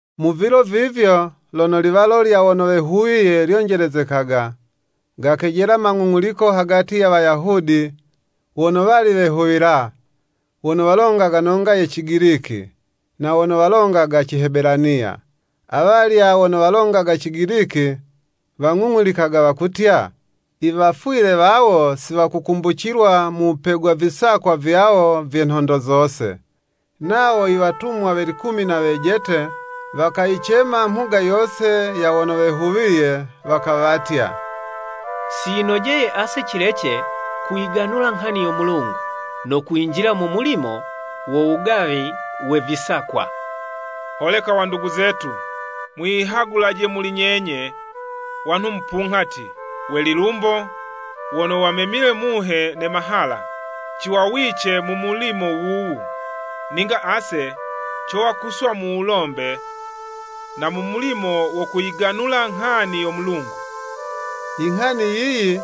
Mu vilo vivyo, lono liwalo lya wono wehuwiye lyonjelezekaga, gakejela mang'ung'uliko hagati ya Wayahudi wono wali wehuwila, wono walongaga nonga ye cigiliki, na wono walongaga Cihebelaniya, awalya wono walongaga Cigiliki, wang'ung'ulikaga wakutya, iwafwile wawo siwakukumbucilwa mu wupegwa visakwa vyawo vye nhondo zose. Nawo iwatumwa we likumi na wejete, wakayicema mhuga yose ya wono wehuwiye, wakawatya, “Si yinojeye ase cilece kuyiganula nghani yo Mulungu, no kwinjila mu mulimo wo wugawi we visakwa. Holeka wandugu zetu, mwiyihagulaje muli nyenye, wanhu mupunghati, we lilumbo, wono wamemile Muhe ne mahala, ciwawice mu mulimo wuwu. Ninga ase, cowa kuswa mu wulombe, na mu mulimo wo kuyiganula nghani yo Mulungu.” Inghani yiyi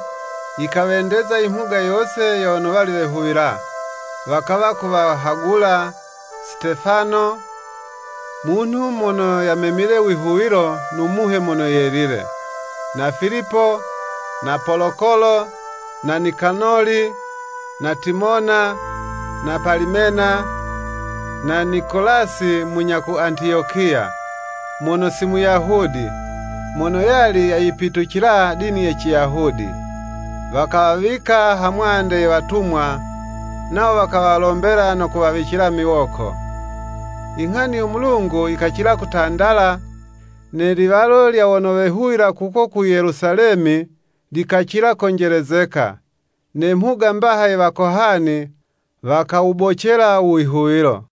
yikawendeza imhuga yose ya wono wali wehuwila, wakawa kuwahagula, Sitefano, munhu mono yamemile wihuwilo no Muhe Mono Yelile, na Filipo, na Polokolo, na Nikanoli, na Timona, na Palimena, na Nikolasi munya ku Antiyokiya, mono si Muyahudi, mono yali yayipitucila dini ye Ciyahudi. Wakawawika ha mwande ye watumwa, nawo wakawalombela no kuwawicila miwoko. Inghani yo Mulungu yikacila kutandala, ne liwalo lya wono wehuwila kuko ku Yelusalemi, likacila konjelezeka, ne mhuga mbaha ye Wakohani, wakawubocela u wihuwilo.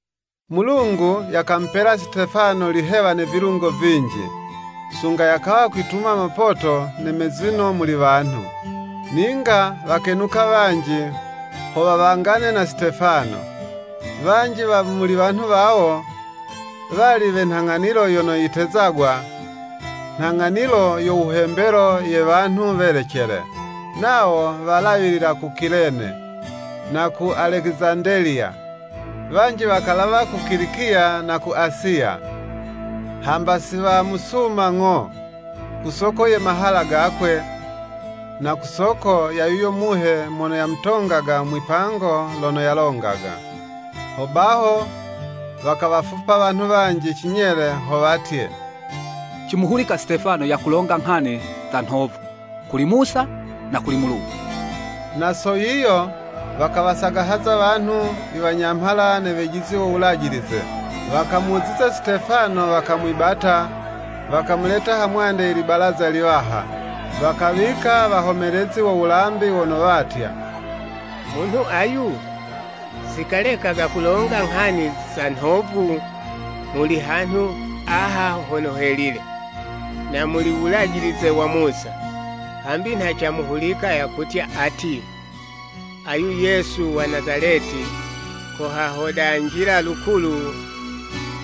Mulungu yakamupela Sitefano lihewa ne vilungo vinji, sunga yakawa kwituma mapoto ne mezino muli wanhu. Ninga wakenuka wanji, ho wawangane na Sitefano, wanji wa muli wanhu wawo, wali we nhang'anilo yono yitezagwa “Nhang'anilo yo wuhembelo ye Wanhu Welecele,” nawo walawilila ku Kilene, na ku Alekizandeliya, wanji wakalawa ku Kilikiya na Asiya. Hamba si wamusuma ng'o, ku soko ye mahala gakwe, na ku soko ya yuyo Muhe mono yamutongaga mwipango lono yalongaga. Hobaho wakawafupa wanhu wanji cinyele, ho watye, “Cimuhulika Sitefano yakulonga nghani za nhovu kuli Musa, na kuli Mulungu.” Na so yiyo wakawasagahaza wanhu, iwanyamhala, ne wejizi wo Wulajilize. Wakamuziza Sitefano, wakamwibata, wakamuleta ha mwande ye libalaza liwaha. Wakawika wahomelezi wo wulambi wono watya, “Munhu ayu si kalekaga kulonga nghani za nhovu muli hanhu aha hono helile, na muli u Wulajilize wa Musa. Hambi nha camuhulika yakutya ati, ayu Yesu wa Nazaleti, kohahodanjila lukulu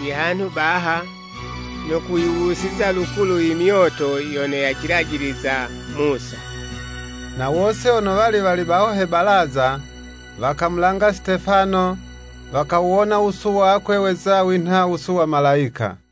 ihanhu baha, no kuyiwusiza lukulu imyoto yono yacilajiliza Musa.” Na wose wono wali wali baho he balaza, wakamulanga Sitefano, wakawuwona wusu wakwe weza winha wusu wa Malayika.